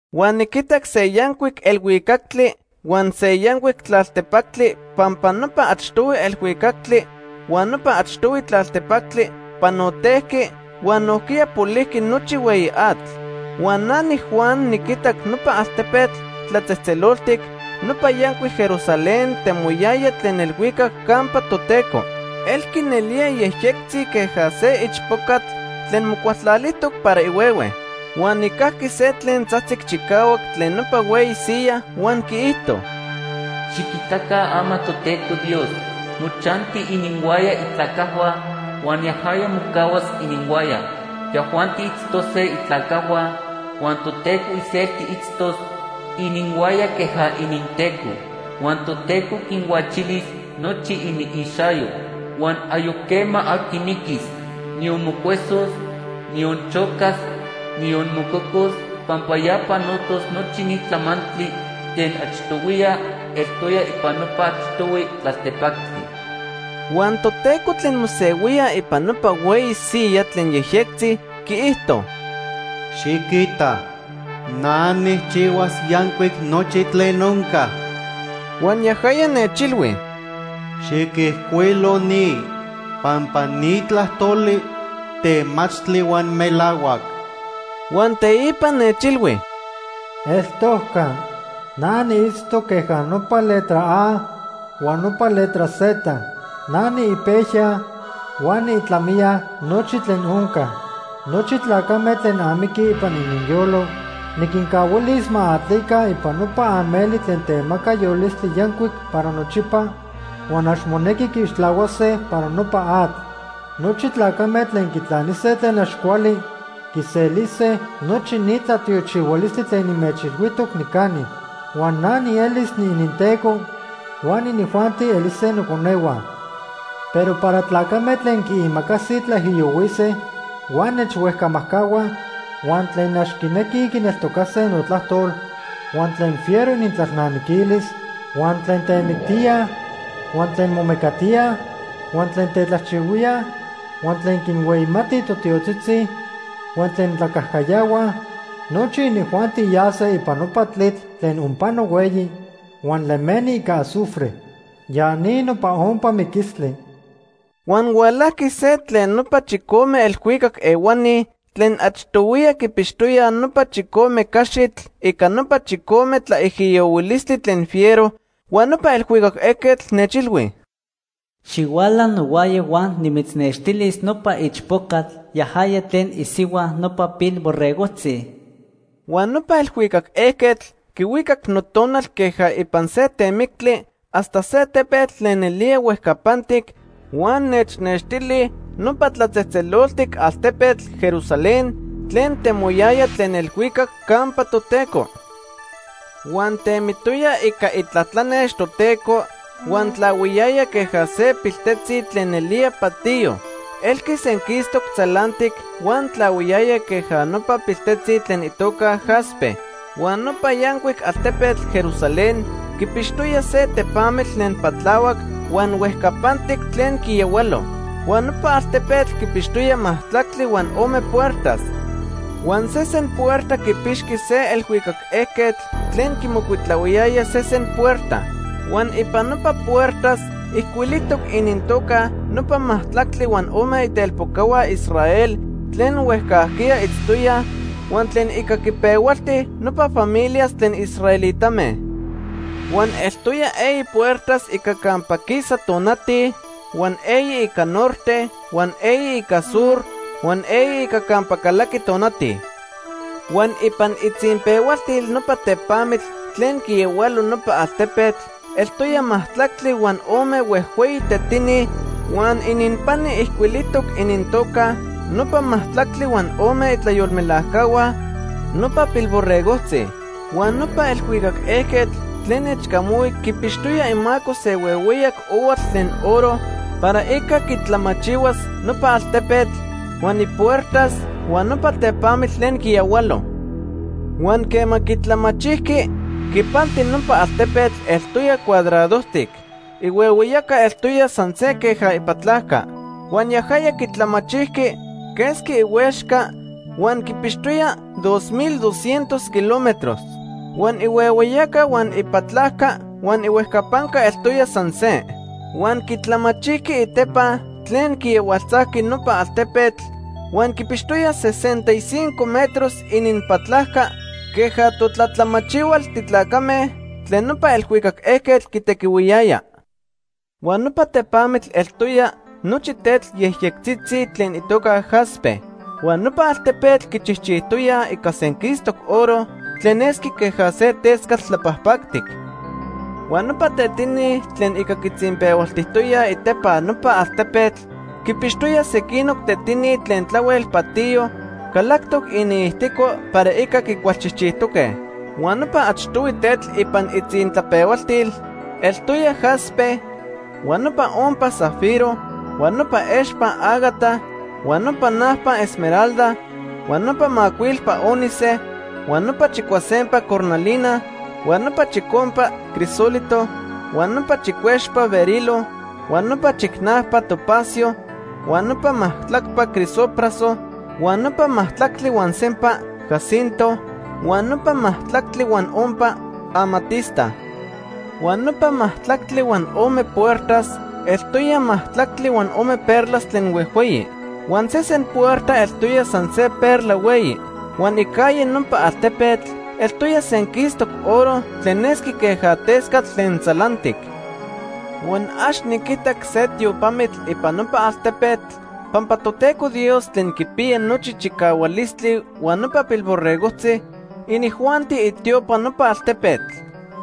Huan niquitac se yancuic elhuicactli huan se yancuic tlaltepactli pampa nopa achtohui elhuicactli huan nopa achtohui tlaltepactli panotejqui huan nojquiya polijqui nochi hueyi atl. Huan na niJuan niquitac nopa altepetl tlatzejtzeloltic, nopa yancuic Jerusalén temoyaya tlen elhuicac campa Toteco. Elqui nelía yejyectzi queja se ichpocatl tlen mocualtlalijtoc para ihuehue. Huan nijcajqui se tlen tzajtzic chicahuac tlen nopa hueyi siyaj huan quiijto: “Xiquitaca ama Toteco Dios mochanti ininhuaya itlacajhua huan yajaya mocahuas ininhuaya. Yajuanti itztose itlacajhua huan Toteco iselti itztos ininhuaya queja ininTeco. Huan Toteco quinhuachilis nochi iniixayo. Huan ayoc quema aqui miquis, niyon mocuesos, niyon chocas, niyon mococos pampa ya panotos nochi ni tlamantli tlen achtohuiya eltoya ipan nopa achtohui tlaltepactli.” Huan Toteco tlen mosehuía ipan nopa hueyi siyaj tlen yejyectzi quiijto: “Xiquita, na nijchijchihuas yancuic nochi tlen onca.” Huan yajaya nechilhui: “Xiquijcuilo ni pampa ni tlajtoli temachtli huan melahuac.” Huan teipa nechilhui: “Eltojca. Na niitztoc queja nopa letra A huan nopa letra Z. Na niipejya huan niitlamiya nochi tlen onca. Nochi tlacame tlen amiquij ipan ininyolo, niquincahuilis ma atlica ipan nopa ameli tlen temaca yolistli yancuic para nochipa huan ax monequi quiixtlahuase para nopa atl. Nochi tlacame tlen quitlanise tlen ax cuali quiselise nochi ni tlatiochihualistli tlen nimechilhuijtoc nicani. Huan na nielis niininTeco, huan inijuanti elise noconehua. Pero para tlacame tlen quiimacasij tlaijiyohuise huan nechhuejcamajcahuaj, huan tlen ax quinequij quineltocase notlajtol, huan tlen fiero inintlalnamiquilis, huan tlen temictíaj, huan tlen momecatíaj, huan tlen tetlajchihuíaj, huan tlen quinhueyimatij totiotzitzi, huan tlen tlacajcayahuaj; nochi inijuanti yase ipan nopa tlitl tlen onpano hueyi huan lemeni ica azufre. Ya ni nopa ompa miquistli.” Huan hualajqui se tlen nopa chicome elhuicac ehuani tlen achtohuiya quipixtoyaj nopa chicome caxitl ica nopa chicome tlaijiyohuilistli tlen fiero, huan nopa elhuicac ejquetl nechilhui: “Xihuala nohuaya huan nimitznextilis nopa ichpocatl, yajaya tlen isihua nopa Pilborregojtzi.” Huan nopa elhuicac ejquetl quihuicac notonal queja ipan se temictli hasta se tepetl tlen nelía huejcapantic huan nechnextili nopa tlatzejtzeloltic altepetl, Jerusalén, tlen temoyaya tlen elhuicac campa Toteco. Huan temitoya ica itlatlanex Toteco huan tlahuiyaya queja se piltetzi tlen nelía patiyo; elqui senquistoc tzalantic huan tlahuiyaya queja nopa piltetzi tlen itoca jaspe. Huan nopa yancuic altepetl Jerusalén quipixtoya se tepamitl tlen patlahuac huan huejcapantic tlen quiyahualo. Huan nopa altepetl quipixtoya majtlactli huan ome puertas. Huan sesen puerta quipixqui se elhuicac ejquetl tlen quimocuitlahuiyaya sesen puerta. Huan ipan nopa puertas ijcuilijtoc inintoca nopa majtlactli huan ome itelpocahua Israel tlen huejcajquiya itztoyaj huan tlen ica quipehualti nopa familias tlen israelitame. Huan eltoya eyi puertas ica campa quisa tonati, huan eyi ica norte, huan eyi ica sur, huan eyi ica campa calaqui tonati. Huan ipan itzinpehualtil nopa tepamitl tlen quiyahualo nopa altepetl eltoya majtlactli huan ome huejhueyi tetini huan ininpani ijcuilijtoc inintoca nopa majtlactli huan ome itlayolmelajcahua nopa Pilborregojtzi. Huan nopa elhuicac ejquetl tlen nechcamahui quipixtoya imaco se huehueyac ohuatl tlen oro para ica quitlamachihuas nopa altepetl, huan ipuertas, huan nopa tepamitl tlen quiyahualo. Huan quema quitlamachijqui, quipanti nopa altepetl eltoya cuadradojtic. Ihuehueyaca eltoya san se queja ipatlajca. Huan yajaya quitlamachijqui quesqui ihuexca huan quipixtoya dos mil doscientos kilómetros. Huan ihuehueyaca huan ipatlajca huan ihuejcapanca eltoya san se. Huan quitlamachijqui itepa tlen quiyahualtzajqui nopa altepetl huan quipixtoya sesenta y cinco metros ininpatlajca queja totlatlamachihual titlacame tlen nopa elhuicac ejquetl quitequihuiyaya. Huan nopa tepamitl eltoya nochi tetl yejyectzitzi tlen itoca jaspe. Huan nopa altepetl quichijchijtoya ica senquistoc oro tlen nesqui queja se tescatl tlapajpactic. Huan nopa tetini tlen ica quitzinpehualtijtoyaj itepa nopa altepetl quipixtoya sequinoc tetini tlen tlahuel patiyo calactoc iniijtico para ica quicualchijchijtoque. Huan nopa achtohui tetl ipan itzintlapehualtil eltoya jaspe, huan nopa ompa zafiro, huan nopa expa ágata, huan nopa najpa esmeralda, huan nopa macuilpa ónice, huan nopa chicuasempa cornalina, huan nopa chicompa crisólito, huan nopa chicuexpa berilo, huan nopa chicnajpa topacio, huan nopa majtlacpa crisopraso, huan nopa majtlactli huan sempa jacinto, huan nopa majtlactli huan ompa amatista. Huan nopa majtlactli huan ome puertas eltoya majtlactli huan ome perlas tlen huejhueyi. Huan sesen puerta eltoya san se perla hueyi. Huan icalle nopa altepetl eltoya senquistoc oro tlen nesqui queja tescatl tlen tzalantic. Huan ax niquitac se tiopamitl ipan nopa altepetl pampa Toteco Dios Tlen Quipiya Nochi Chicahualistli huan nopa Pilborregojtzi, inijuanti itiopa nopa altepetl.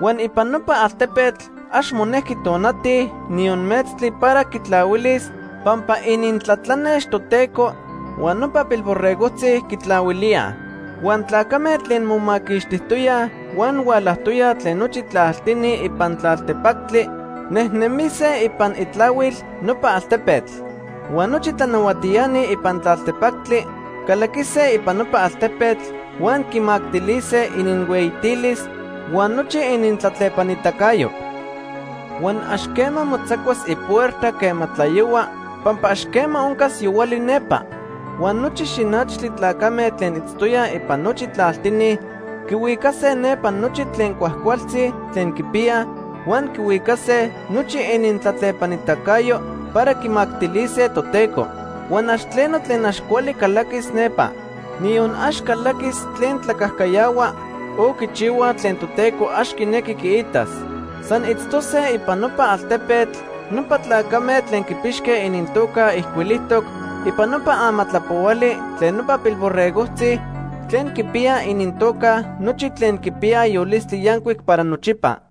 Huan ipan nopa altepetl ax monejqui tonati, niyon metztli para quitlahuilis pampa inintlatlanex Toteco huan nopa Pilborregojtzi quitlahuilía. Huan tlacame tlen momaquixtijtoyaj huan hualajtoyaj tlen nochi tlaltini ipan tlaltepactli nejnemise ipan itlahuil nopa altepetl. Huan nochi tlanahuatiani ipan tlaltepactli calaquise ipan nopa altepetl huan quimactilise ininhueyitilis huan nochi inintlatlepanitacayo. Huan ax quema motzacuas ipuerta quema tlayohua pampa ax quema oncas yohuali nepa. Huan nochi xinachtli tlacame tlen itztoyaj ipan nochi tlaltini quihuicase nepa nochi tlen cuajcualtzi tlen quipiyaj, huan quihuicase nochi inintlatlepanitacayo para quimactilise Toteco. Huan ax tleno tlen ax cuali calaquis nepa. Niyon ax calaquis tlen tlacajcayahua o quichihuaj tlen Toteco ax quinequi quiitas. San itztose ipan nopa altepetl nopa tlacame tlen quipixque inintoca ijcuilijtoc ipan nopa amatlapohuali tlen nopa Pilborregojtzi tlen quipiya inintoca nochi tlen quipiyaj yolistli yancuic para nochipa.